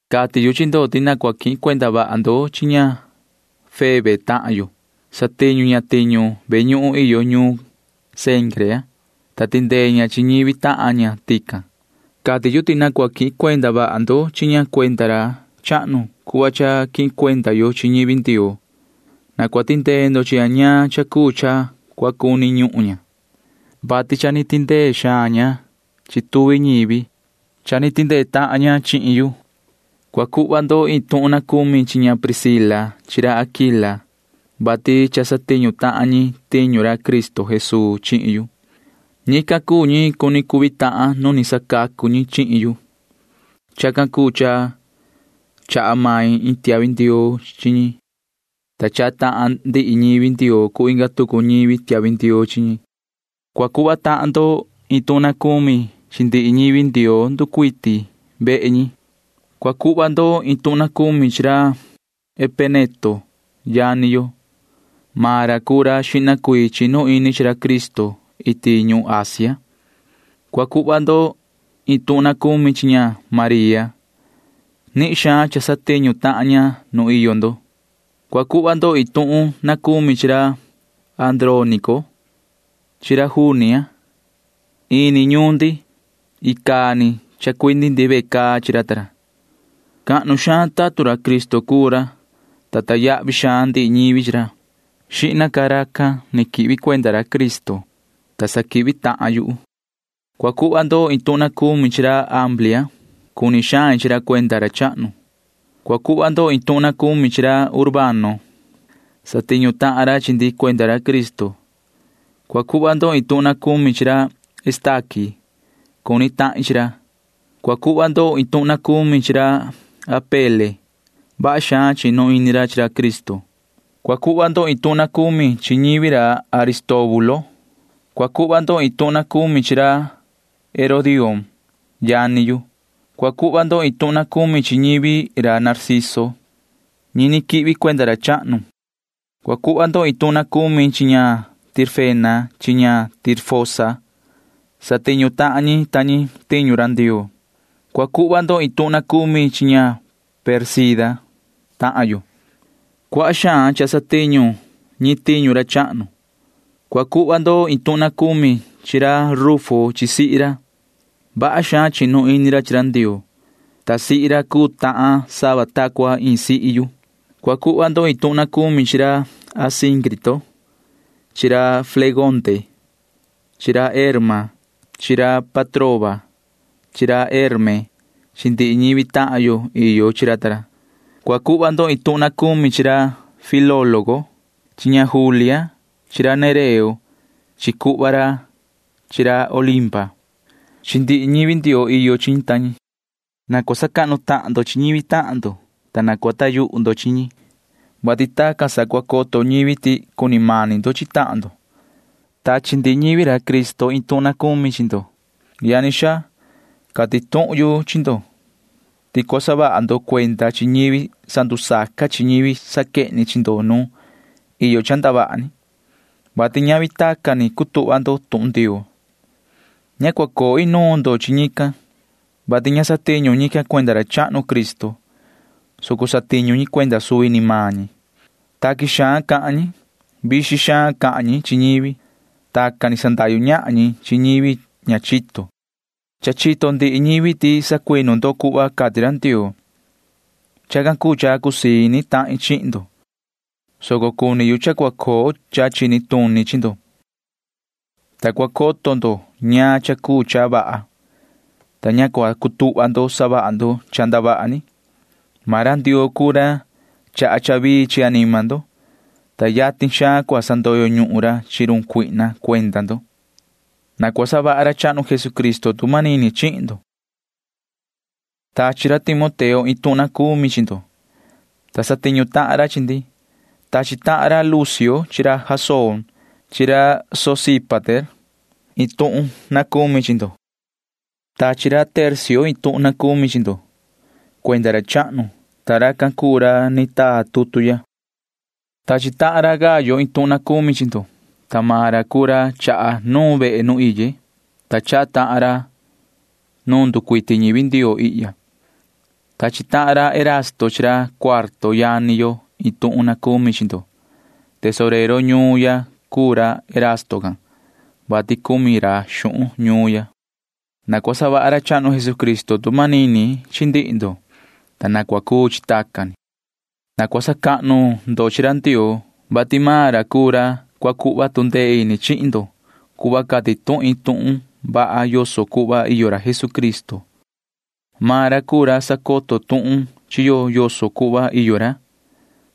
Cati yu chi ndo ti na cua quihin cuenda vaha ndo chi ña Febe tahan yo. Satiñu ña tiñu ve ñuhun iyo ñuun Cencrea, ta tindee ña chi ñivi tahan ña tican. Cati yu ti na cua quihin cuenda vaha ndo chi ña cuenda ra chahnu cuhva iyo cha quihin cuenda yo chi ñivi Ndioo. Na cua tindee ndo chi ña ñaan cha cuu cha cua cuni ñuhun ña, vati cha ni tindee xaan ña chi tuvi ñivi. Cha ni tindee tahan ña chihin yu. Cua cuhva ndo iin tuhun na cumi chi ña Priscila chi ra Aquila, vati cha ni satiñu tahan ñi tiñu ra Cristo Jesuu chihin yu. Ñican cuu ñi cuni cuvi tahan nu ni sacacu ñi chihin yu. Chacan cuu cha chaha main iin tiahvi ndioo chi ñi, ta chaha tahan ndihi ñivi Ndioo cuu inga tucu ñivi tiahvi ndioo chi ñi. Cua cuhva tahan ndo iin tuhun na cumi chi ndihi ñivi Ndioo nducuiti vehe ñi. Cua cuhva ndo iin tuhun na cumi chi ra Epeneto yani yo. Maan ra cuu ra xihna cuii chinu ini chi ra Cristo iti ñuhun Asia. Cua cuhva ndo iin tuhun na cumi chi ña María. Nihin xaan cha satiñu ña iti nuun ndo. Cua cuhva ndo iin tuhun na cumi chi ra Andrónico chi ra Junia. Ini ñuun cuu ñuun ndi, ta ni chacoo tahan ra ta ra chihin yu ve caa. Cahnu xaan tatun ra Cristo cuu ra, ta sacahnu ndihi ñivi chi ra. Xihna ca racan ni quihvi cuenda ra Cristo, ta sa quihvi tahan yuhu. Cua cuhva ndo iin tuhun na cumi chi ra Amplia. Cuni xain chi ra cuenda ra chahnu. Cua cuhva ndo iin tuhun na cumi chi ra Urbano. Satiñu tahan ra chi ndi cuenda ra Cristo. Cua cuhva ndo iin tuhun na cumi chi ra Estaqui. Cuni tahin chi ra. Cua cuhva ndo iin tuhun na cumi chi ra Apele. Vaha xaan chinu ini ra chi ra Cristo. Cua cuhva ndo iin tuhun na cumi chi ñivi ra Aristóbulo. Cua cuhva ndo iin tuhun na cumi chi ra Herodión tahin. Cua cuhva ndo iin tuhun na cumi chi ñivi ra Narciso―ñi ni quihvi cuenda ra chahnu. Cua cuhva ndo iin tuhun na cumi chi ña Tirfena chi ña Tirfosa. Satiñu tahan ña ta ña tiñu Ndioo. Cua cuhva ndo iin tuhun na cumi chi ña Pérsida tahan yo. Cuaha xaan cha satiñu ña tiñu ra chahnu. Cua cuhva ndo iin tuhun na cumi chi ra Rufo chi sihi ra. Vaha xaan chinu ini ra chi ra Ndioo, ta cha cuu tahan maan sihi ra sava ni ta cua iin sihi yu. Cua cuhva ndo iin tuhun na cumi chi ra Asíncrito chi ra Flegonte chi ra Herma chi ra Patroba chi ra Herme chi ndihi ñivi tahan yo iyo chi ra ta ra. Cua cuhva ndo iin tuhun na cumi chi ra Filólogo chi ña Julia chi ra Nereo chi cuhva ra chi ra Olimpa chi ndihi ñivi Ndioo iyo chi ñi ta ñi. Na cua sacahnu tahan ndo chi ñivi tahan ndo, ta na cua coho ndo yuhu tahan ndo, [vati tacan sa cua coto ñivi ti cuni mani ndo chi tahan ndo]. Tachi ndihi ñivi Cristo iin tuhun na cumi chi ndo. Yani xaa, cati tuhun yu chi ndo ti cua saha vaha ndo cuenda chi ñivi sandusaca chi ñivi saquehni chi ndo nu iyo cha ndavaha ni, vati ñavi tacan ni cutuhva ndo tuhun Ndioo. Ña cua coo inuun ndo chi ñican, vati ña satiñu ñican cuenda ra chahnu Cristo, soco satiñu ñi cuenda suvi ni maan ñi. Taqui xaan cahan ñi. Savixin ñahan ñi chi ñivi. Tacan ni sandahyu ñahan ñi chi ñivi ña chito. Cha chito ndihi ñivi ti sacuinu ndo cuhva cati ra Ndioo. Chacan cuu cha cusii ini tahin chihin ndo, soco cuni yu cha cua coo cha chini tuni chi ndo, ta cua coto ndo ñaan cha cuu cha vaha, ta ña cua cutuhva ndo savaha ndo cha ndavaha ni. Maan ra Ndioo cuu ra chaha cha vii chi anima ndo, ta yatin xaan cua sandoyo ñuhun ra chi run Satanaa cuenda ndo. Na cua savaha ra chahnu Jesucristo tu manini chihin ndo. Tachi ra Timoteo iin tuhun na cumi chi ndo, ta satiñu tahan ra chi ndi. Tachi tahan ra Lucio chi ra Jasón chi ra Sosípater ñivi tahin iin tuhun na cumi chi ndo. Tachi ra Tercio iin tuhun na cumi chi ndo cuenda ra chahnu, ta racan cuu ra ni taa tutu ya. Tachi tahan ra Gayo iin tuhun na cumi chi ndo, ta maan ra cuu ra chaha nuun vehe nu iye, ta chaha tahan ra nu nducuiti ñivi Ndioo ihya. Tachi tahan ra Erasto chi ra Cuarto yani yo iin tuhun na cumi chi ndo. Tesorero ñuun ya cuu ra Erasto can, [vati cumi ra xuhun ñuun ya]. Na cua savaha ra chahnu Jesucristo tu manini chi ndihi ndo, ta na cua cuu chi tacan ni. Na cua sacahnu ndo chi ra Ndioo, vati maan ra cuu ra cua cuhva tu ndee ini chihin ndo cuhva cati tuhin tuhun vaha yoso cuhva iyo ra Jesucristo. Maan ra cuu ra sacoto tuhun chi yo yoso cuhva iyo ra,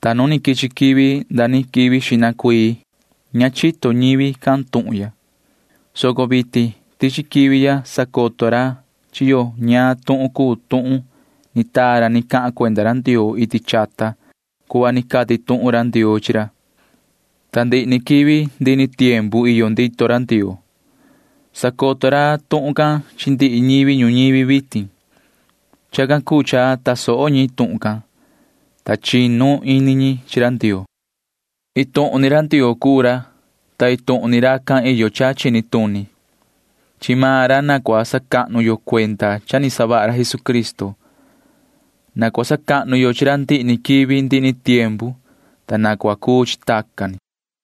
ta nu ni quichi quivi nda ni quivi xihna cuii ña ta coto ñivi tuhun can, soco vitin tichi quivi ya sacoto ra chi yo ñaan tuhun cuu tuhun ni taa ra ni cahan cuenda ra Ndioo iti chata cuhva ni cati tuhun ra Ndioo chi ra, ta ndihi ni quivi ndihi ni tiempu iyo ndito ra Ndioo. Sacoto ra tuhun can chi ndihi ñivi ñuñivi vitin. Chacan cuu cha tasoho ñi tuhun can, ta chinu ini ñi chi ra Ndioo. Iin tuhun ni Ndioo cuu ra, ta iin tuhun ni racan iyo cha chini tuni. Chi maan ra na cua sacahnu yo cuenda cha ni savaha ra Jesucristo. Na cua sacahnu yo chi ra ndihi ni quivi ndihi ni tiempu, ta na cua cuu chi tacan ni.